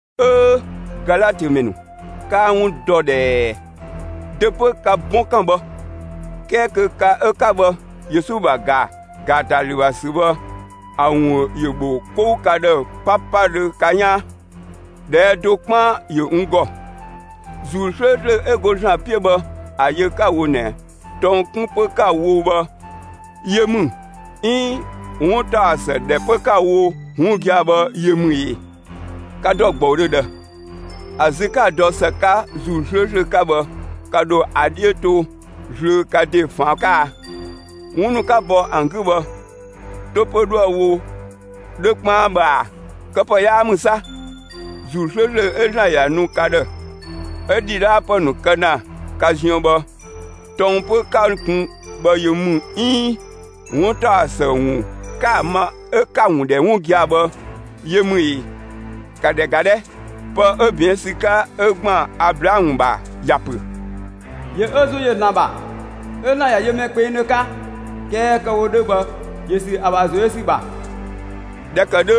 'Öö, Galatö ‑mɛ ‑nu, 'kaa 'wun dɔ ꞊dhɛɛ! Dö 'pö ka 'bɔnkan bhë? 'Kɛɛ kö ka 'ö 'ka bhë, Yesu ‑bha ‑ga ‑gaatalü ‑bha ‑sü bhë ‑a ‑wun ‑yö ‑bho 'kou ka ‑dhë 'papadhö ka 'yaan. ꞊Dhɛɛ' do 'kpaan ‑yö n ‑gɔ. ‑Zuu 'slööslö 'ö go ‑Zlan 'piö bhë ‑a yö 'ka‑ wo ꞊nɛ, tɔng 'kun 'pö 'ka‑ wo bhë yö ‑mü 'iin 'wuntaɔsë ‑dhɛ 'pö 'ka‑ wo 'wun gia‑ bhë yö ‑mü ‑ee? Ka ‑dɔ ‑gbɔudhö ꞊dhë? ‑A zü 'ka‑ dɔ ‑së 'ka ‑Zuu 'slööslö 'ka bhë, ka ‑dho ‑a 'dhiö to zlöö ka ‑de ꞊faan' 'ka a? 'Wun ‑nu 'ka bɔ ‑an 'gü bhë, 'to 'pö 'dhoë‑ wo 'dhö 'kpaan bhë ꞊a? Këpë 'yaa ‑mü 'sa! ‑Zuu 'slööslö 'ö ‑Zlan ‑ya nu ka ‑dhë, 'ö ‑dhidhaapë ‑nu kë ‑na ka ziën bhë, tɔng 'pö 'ka‑ kun bhë yö ‑mü 'iin 'wuntaɔsë ‑wun 'ka‑ ma 'ö 'ka‑ ‑wun ‑dhɛ 'wun gia‑ bhë yö ‑mü ee? ‑Ka ‑dhɛ ‑ga 'dhɛ! Pë 'ö ꞊bɛɛn' ‑sü 'ka 'ö ‑gban Ablaamö ‑bha ‑ya ‑pö: ‑Yö ö ‑zo ‑yö ‑Zlan ‑bha 'ö ‑Zlan ‑ya yö mɛ kpengdhö 'ka; 'kɛɛ kë‑ wo 'dhö bhë, ‑yö ‑sü ‑a ‑bha ‑zo yö ‑sü ‑bha. ꞊Dhɛ ‑kë 'dhö,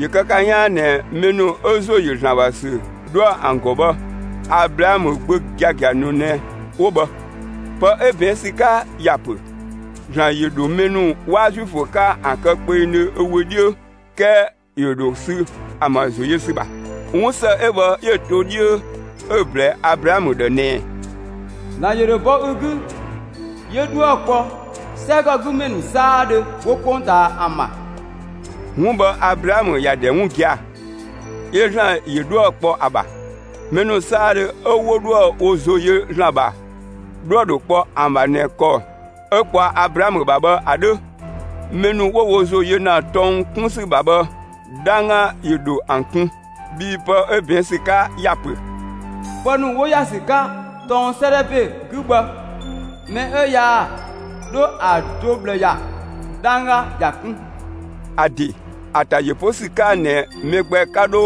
‑yö kë ka 'yaan ꞊nɛ mɛ ‑nu 'ö ‑zo yö ‑Zlan ‑bha ‑sü 'dhoë‑ ‑an ‑gɔ bhë, Ablaamö gbö giagia ‑nu ꞊nɛ 'wo bhë. Pë 'ö ꞊bɛɛn' ‑sü 'ka ‑ya ‑pö ‑Zlan ‑yö ‑dho mɛ ‑nu 'waa Zuifö 'ka ‑an kë kpengdhö ö wö 'dhiö, 'kɛɛ ‑yö ‑dho sü ‑an ‑bha ‑zo yö ‑sü ‑bha; 'wunsë 'ö bhë 'yö‑ to 'dhiö 'ö‑ ꞊blɛɛ Ablaamö ‑dhë ꞊nɛ: ‑Zlan ‑yö ‑dho bɔ ü 'gü 'yö 'dhuë‑ kpɔ 'sɛgɔgümɛ ‑nu 'saadhö 'wo 'kpongtaa ‑an ‑bha. 'Wun bhë Ablaamö ‑ya ‑dhɛ 'wun gia‑; 'yö ‑Zlan ‑yö 'dhuë‑ kpɔ ‑a ‑bha. Mɛ ‑nu 'saadhö 'ö 'wo 'dhoë‑ wo ‑zo yö ‑Zlan ‑bha, 'dhuë‑ ‑dho kpɔ ‑an ‑bha ꞊nɛ ‑kɔ 'ö kpɔa Ablaamö ‑bha bhë ‑a 'dhö. Mɛ ‑nu 'wo wo ‑zo yö ‑na tɔng 'kun ‑sü ‑bha bhë, 'dhangga ‑yö ‑dho ‑an kun. Bhii pë 'ö ꞊bɛɛn' ‑sü 'ka ‑ya pö: «Pë ‑nu 'wo ‑ya ‑sü 'ka tɔng 'sëëdhɛ ‑be 'gü bhë, mɛ 'ö yaa 'dho ‑a do ꞊bhlë ‑ya, 'dhangga ‑ya 'kun.» ‑A ‑de ‑a ‑ta ‑yö 'po ‑sü 'ka ꞊nɛ mɛ gbɛ 'ka 'dho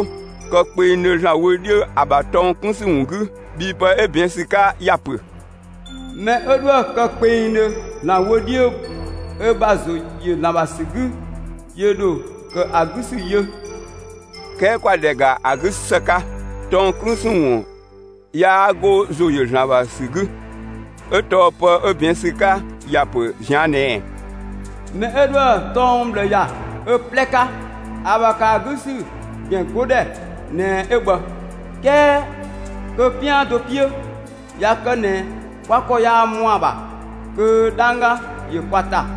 kë kpengdhö ‑Zlan wö 'dhiö ö ‑bha tɔng 'kun ‑sü ‑wun 'gü; bhii pë 'ö ꞊bɛɛn' ‑sü 'ka ‑ya ‑pö: Mɛ 'ö 'dhoë‑ kë kpengdhö ‑Zlan wö 'dhiö ö ‑bha ‑zo ‑yö ‑Zlan ‑bha ‑sü ‑wun 'gü, ‑yö ‑dho ‑kë ‑a 'gü ‑sü yö. 'Kɛɛ ‑kwa ‑dhɛ ‑ga ‑a 'gü ‑së 'ka; tɔng 'kun ‑sü ‑wun yaa 'go ‑zo ‑yö ‑Zlan ‑bha ‑sü 'gü. 'Ö tɔɔ pë 'ö ꞊bɛɛn' ‑sü 'ka ‑ya ‑pö ꞊zian' ꞊nɛɛ: Mɛ 'ö 'dhoë‑ tɔng ꞊bhlë ‑ya ö 'plɛ 'ka, ‑a ‑bha ‑kë ‑a 'gü ‑sü ‑gɛn 'godhɛ ꞊nɛ 'ö bhë. ('Kɛɛ kö 'pian do 'piö, ꞊ya kë ꞊nɛ kwa ‑kɔ yaa ‑mɔa ‑bha, kö 'dhangga ‑yö kwa ‑ta.)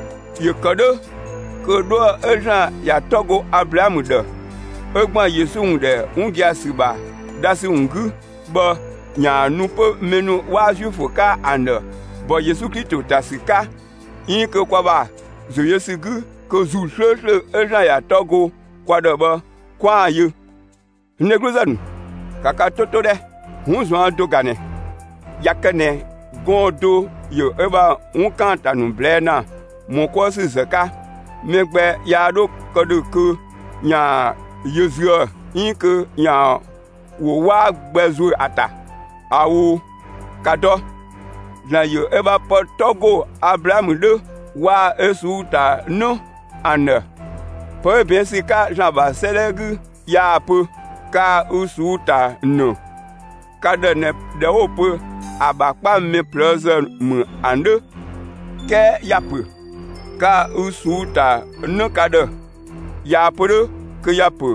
‑Yö ‑kë 'dhö kö 'dhuë‑ 'ö ‑Zlan ‑ya 'tɔ go Ablaamö ‑dhë ('ö ‑gban Yesu ‑wun ‑dhɛ 'wun gia‑ ‑sü ‑bha dhasü ‑wun 'gü) bhë ‑yaan nu 'pö mɛ ‑nu 'waa Zuifö 'ka ‑an ‑dhë ‑bɔ Yesu Klito ‑ta ‑sü 'ka 'iin kö kwa ‑bha ‑zo yö ‑sü 'gü kö ‑Zuu 'slööslö 'ö ‑Zlan ‑ya 'tɔ go kwa ‑dhë bhë, 'kwaan‑ yö. N dhegluzë ‑nu, ‑ka ka 'to 'to 'dhɛ! 'Wun ꞊zuan' do ꞊ga ꞊nɛ: ꞊Ya kë ꞊nɛ gɔɔn‑ do ‑yö ö ‑bha 'wun ‑kaanta ‑nu ꞊blɛɛ' ‑na ‑mɔ 'kuë ‑sü ‑zë 'ka, mɛ gbɛ yaa 'dho kë ‑dhö kö ‑yaan yö züë‑ 'iin kö ‑yaan ‑wo 'waa gbɛ ‑zuö ‑a ‑ta. ꞊Ao'! ‑Ka dɔ! ‑Zlan ‑yö ö ‑bha pë 'tɔ ‑go Ablaamö 'dhö waa‑ ö ꞊suu'‑ ‑ta ‑në ‑an ‑dhë. Pë 'ö ꞊bɛɛn' ‑sü 'ka ‑Zlan ‑bha 'sëëdhɛ 'gü yaa‑ pö: Kaa‑ ü ꞊suu'‑ ‑ta ‑në ka ‑dhë ꞊nɛ ꞊dhɛ 'wo‑ pö ‑a ‑bha 'kpa mɛ ꞊plëëzë ‑mü ‑a 'dhö. 'Kɛɛ ‑ya ‑pö: Kaa‑ ü ꞊suu'‑ ‑ta 'në ka ‑dhë. ꞊Yaa‑ pö 'dhö kö ‑ya ‑pö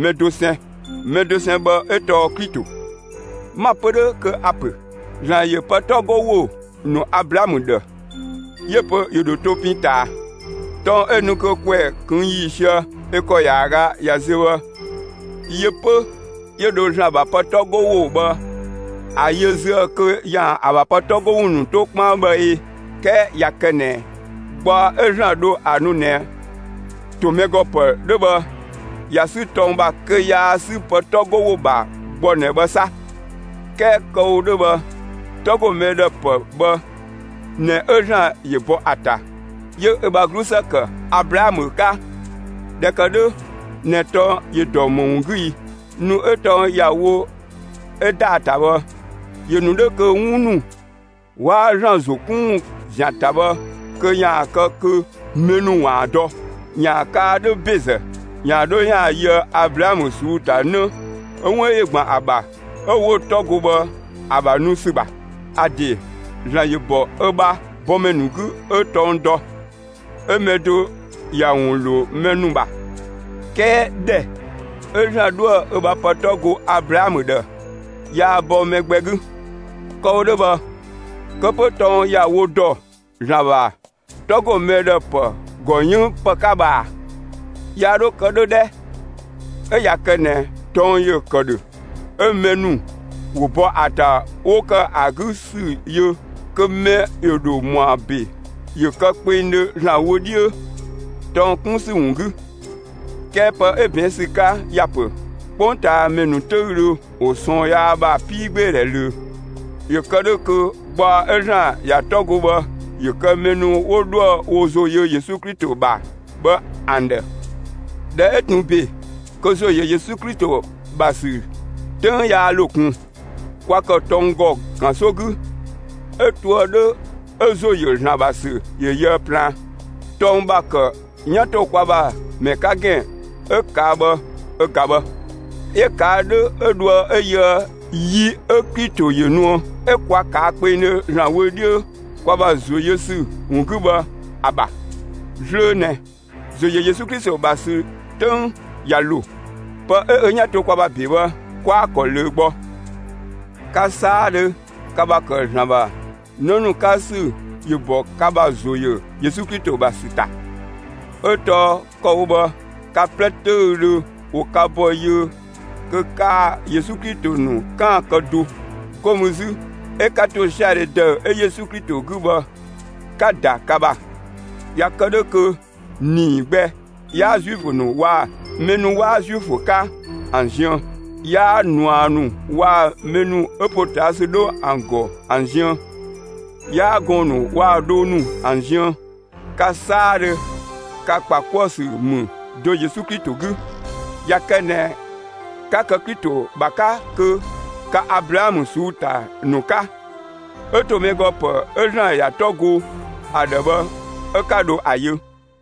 mɛ dosɛn; mɛ dosɛn bhë 'ö tɔɔ Klito. 'Ma‑ pö 'dhö kö a‑ ‑pö: ‑Zlan ‑yö pë 'tɔ 'go ‑wo ‑nu (Ablaamö ‑dhë), 'yö‑ pö ‑yö ‑dho to pin ꞊taa. Tɔng 'ö nu kö ‑kwɛ ꞊këng' ‑yiisië 'ö ‑kɔ ‑yaaga ꞊ya ziö bhë yö 'pö 'yö dho ‑Zlan ‑bha pë 'tɔ 'go ‑wo bhë ‑a yö züë‑ kö ‑yaan ‑a ‑bha pë 'tɔ 'go ‑wo ‑nu 'to 'kpaan bhë ꞊ee? 'Kɛɛ ꞊ya kë ꞊nɛ gbaɔ 'ö ‑Zlan dho ‑a nu ꞊nɛ ‑to mɛ ‑gɔ ‑pë 'dhö bhë ꞊ya 'sü tɔng ‑bha kö yaa 'sü pë 'tɔ 'go ‑wo ‑bha gbɔ ꞊nɛ bhë 'sa. 'Kɛɛ kë‑ wo 'dhö bhë 'tɔ ‑go mɛ ‑dhë ‑pë bhë ꞊nɛ 'ö ‑Zlan ‑yö bɔ ‑a ‑ta 'yö ö ‑bha 'glusë ‑kë Ablaamö 'ka. ꞊Dhɛ ‑kë 'dhö ꞊nɛ tɔng ‑yö ‑dɔ ‑më ‑wun 'gü i? Nu 'ö tɔng ‑ya wo 'ö ‑daa ‑ta bhë, ‑yö ‑nu 'dhö kö 'wun ‑nu 'waa ‑Zlan ‑zo 'kun ‑wun ‑zian ‑ta bhë kö ‑yaan kë kö mɛ ‑nu ‑waan dɔ, ‑yaan kaa 'dhö ‑bezë ‑yaan 'dho ‑yaan yöë Ablaamö ꞊suu'‑ ‑ta ‑në 'ö 'wun ‑yö ‑gban ‑a ‑bha 'ö 'wo‑ 'tɔ go bhë, ‑a ‑bha nu ‑sü ‑bha. ‑A ‑de ‑Zlan ‑yö ‑bɔ ö ‑bha bɔmɛ ‑nu 'gü 'ö tɔng dɔ, 'ö mɛ do ‑ya ‑wun ‑lo mɛ ‑nu ‑bha; 'kɛɛ ‑dhɛ 'ö ‑Zlan 'dhoë‑ ö ‑bha pë 'tɔ go (Ablaamö ‑dhë), yaa bɔ mɛ gbɛ 'gü. Kë‑ wo 'dhö bhë, kë 'pö tɔng ‑ya wo ‑dɔ ‑Zlan ‑bha 'tɔ 'go ‑mɛ ‑dhë ‑pë ‑gɔ 'yënng ‑pë 'ka bhë ꞊a? Yaa 'dho kë 'dhö 'dhɛ! 'ö ꞊ya kë ꞊nɛ tɔng ‑yö ‑kë ‑dhö 'ö mɛ ‑nu ‑wo bɔ ‑a ‑ta 'wo ‑kë ‑a 'gü ‑sü yö kö mɛ ‑yö ‑dho ‑mɔa ‑be ‑yö kë kpengdhö ‑Zlan wö 'dhiö tɔng 'kun ‑sü ‑wun 'gü. 'Kɛɛ pë 'ö ꞊bɛɛn' ‑sü 'ka ‑ya ‑pö, 'kpongtaamɛ ‑nu 'töüdhö ‑wo ꞊sɔɔn yaa ‑bha 'piigbeedhɛ ꞊löö, ‑yö kë 'dhö kö gbaɔ 'ö ‑Zlan ‑ya 'tɔ go bhë ‑yö kë mɛ ‑nu 'wo 'dhoë‑ wo ‑zo yö Yesu Klito ‑bha bhë ‑an ‑dhë. ꞊Dhɛ 'ö ꞊tun ‑be kö ‑zo ‑yö Yesu Klito ‑bha ‑sü 'töng yaa ‑lo ꞊kun, kwa ‑kë tɔng ‑gɔ ‑kanso 'gü 'ö toë 'dhö 'ö ‑zo ‑yö ‑Zlan ‑bha ‑sü ‑yö yöë plaan. Tɔng ‑bha ‑kë 'yan ‑to kwa ‑bha ‑mɛ 'ka ‑gɛn 'ö ꞊kaa' bhë ö ꞊ga bhë. 'Yö‑ ꞊kaa' 'dhö 'ö dhoë 'ö yöë yi 'ö Klito ‑yö nuë 'ö 'kwa ꞊kaa' kpengdhö ‑Zlan wö 'dhiö kwa ‑bha ‑zo yö ‑sü ‑wun 'gü bhë ‑a ‑bha. Zlöö ꞊nɛ, ‑zo ‑yö Yesu Klito ‑bha ‑sü 'töng ꞊ya ‑lo. Pë 'ö ö 'yan to kwa ‑bha ‑be bhë, 'kwaa‑ ‑kɔ ꞊löö gbɔ. Ka 'saadhö ka ‑bha ‑kë ‑Zlan ‑bha 'në ‑nu 'ka ‑sü ‑yö ‑bɔ ka ‑bha ‑zo ‑yö Yesu Klito ‑bha ‑sü ‑ta. 'Ö tɔɔ kë‑ wo bhë ka 'plɛ 'töüdhö ‑wo ka ‑bɔ yiö kö kaa‑ Yesu Klito ‑nu 'kaan‑ kë do; 'go mü 'zü, 'ö 'ka ‑tosiadhe ‑dëü 'ö Yesu Klito 'gü bhë, 'ka‑ ‑da ka ‑bha. ꞊Ya kë 'dhö kö ‑nii gbɛ 'yaa Zuifö ‑nu waa‑ mɛ ‑nu 'waa Zuifö 'ka ‑an ziën; 'yaa ꞊nua ‑nu waa‑ mɛ ‑nu 'ö ‑potaasü 'dho ‑an ‑gɔ ‑an ziën; 'yaa gɔɔn‑ ‑nu waa‑ dhoo ‑nu ‑an ziën. Ka 'saadhö ka ‑kpa 'kuë‑ ‑sü ‑mü do Yesu Klito 'gü. ꞊Ya kë ꞊nɛ 'ka kë Klito ‑bha 'ka kö ka Ablaamö ꞊suu'‑ ‑ta ‑nu 'ka, 'ö ‑to mɛ ‑gɔ ‑pë 'ö ‑Zlan ‑ya 'tɔ go ‑a ‑dhë bhë 'ö 'ka dho ‑a yö.